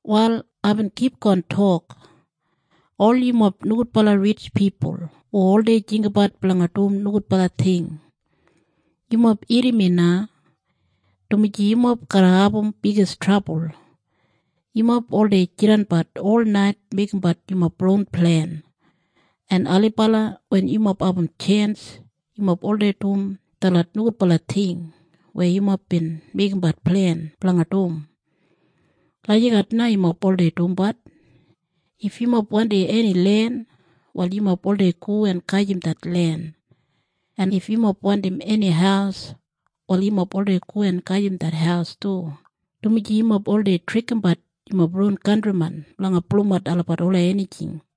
Wal aibin kipgon tok, “Ol yumob nogudbala ritj pipul hu oldei jinggabat blanga dum nogudbala ting, yumob irrim mi na, dumaji yumob garra abum bigis trabul. Yumob oldei jidanbat olnait meigimbat yumob ron plen, en ailibala wen yumob abum tjens, yumob oldei dum detlot nogudbala ting weya yumob bin meigimbat plen blanga dum. Lagijat na yumob oldei dumbat. If yumob wandim eni len, wal yumob oldei go en gajim det len. En if yumob wandim eni haus, wal yumob oldei go en gajim det haus du, dumaji yumob oldei trikimbat yumob ron kantrimen blanga pulumat olabat ola enijing.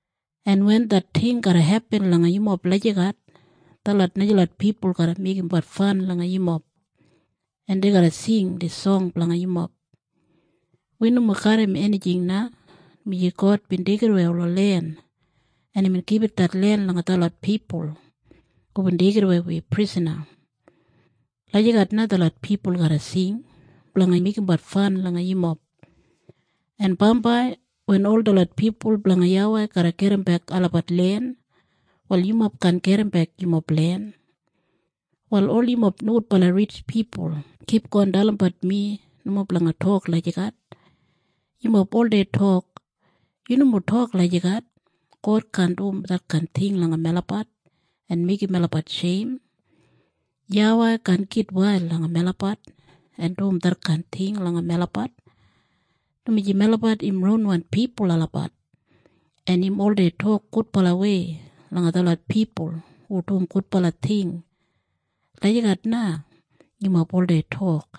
En wen det ting garra hepin langa yumob lagijat, detlot najalot pipul garra meigimbat fan langa yumob, en dei garra sing dis song blanga yumob. “‘Wi nomo garram enijing na, dumaji God bin deigidawei ola len, en imbin gibit det len langa detlot pipul hubin deigidawei wi prisana.’ “Lagijat na detlot pipul garra sing blanga meigimbat fan langa yumob. “En bambai wen ol detlot pipul blanga YAWEI garra gedimbek olabat len, wal yumob kaan gedimbek yumob len. “Wal ol yumob nogudbala ritj pipul kipgon dalimbat mi nomo blanga tok lagijat. Yumob oldei tok, ‘Yu nomo tok lagijat. God kaan dum detkain ting langa melabat en meigim melabat sheim. YAWEI kaan gitwail langa melabat en dum detkain ting langa melabat, dumaji melabat im ronwan pipul olabat, en im oldei tok gudbalawei langa detlot pipul hu dum gudbala ting.’ Lagijat na yumob oldei tok.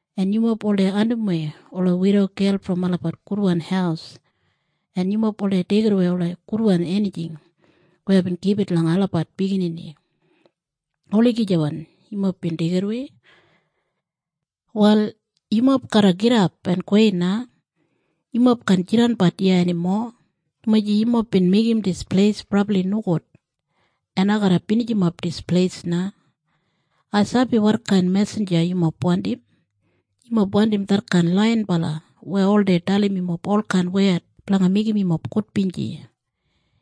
En yumob oldei andimwei ola widogel brom olabat gudwan haus, en yumob oldei deigidawei ola gudwan enijing weya aibin gibit langa olabat biginini. Olagijawan yumob bin deigidawei. “‘Wal yumob garra gidap en gowei na. Yumob kaan jidanbat iya enimo, dumaji yumob bin meigim dis pleis brabli nogud, en ai garra binijimap dis pleis na. Ai sabi wotkain mesinja yumob wandim. Yumob wandim detkain laiyinbalawan weya oldei dalim yumob olkain wed blanga meigim yumob gudbinji.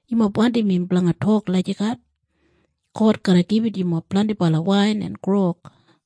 Yumob wandim im blanga tok lagijat, God garra gibit yumob blendibala wain en grog.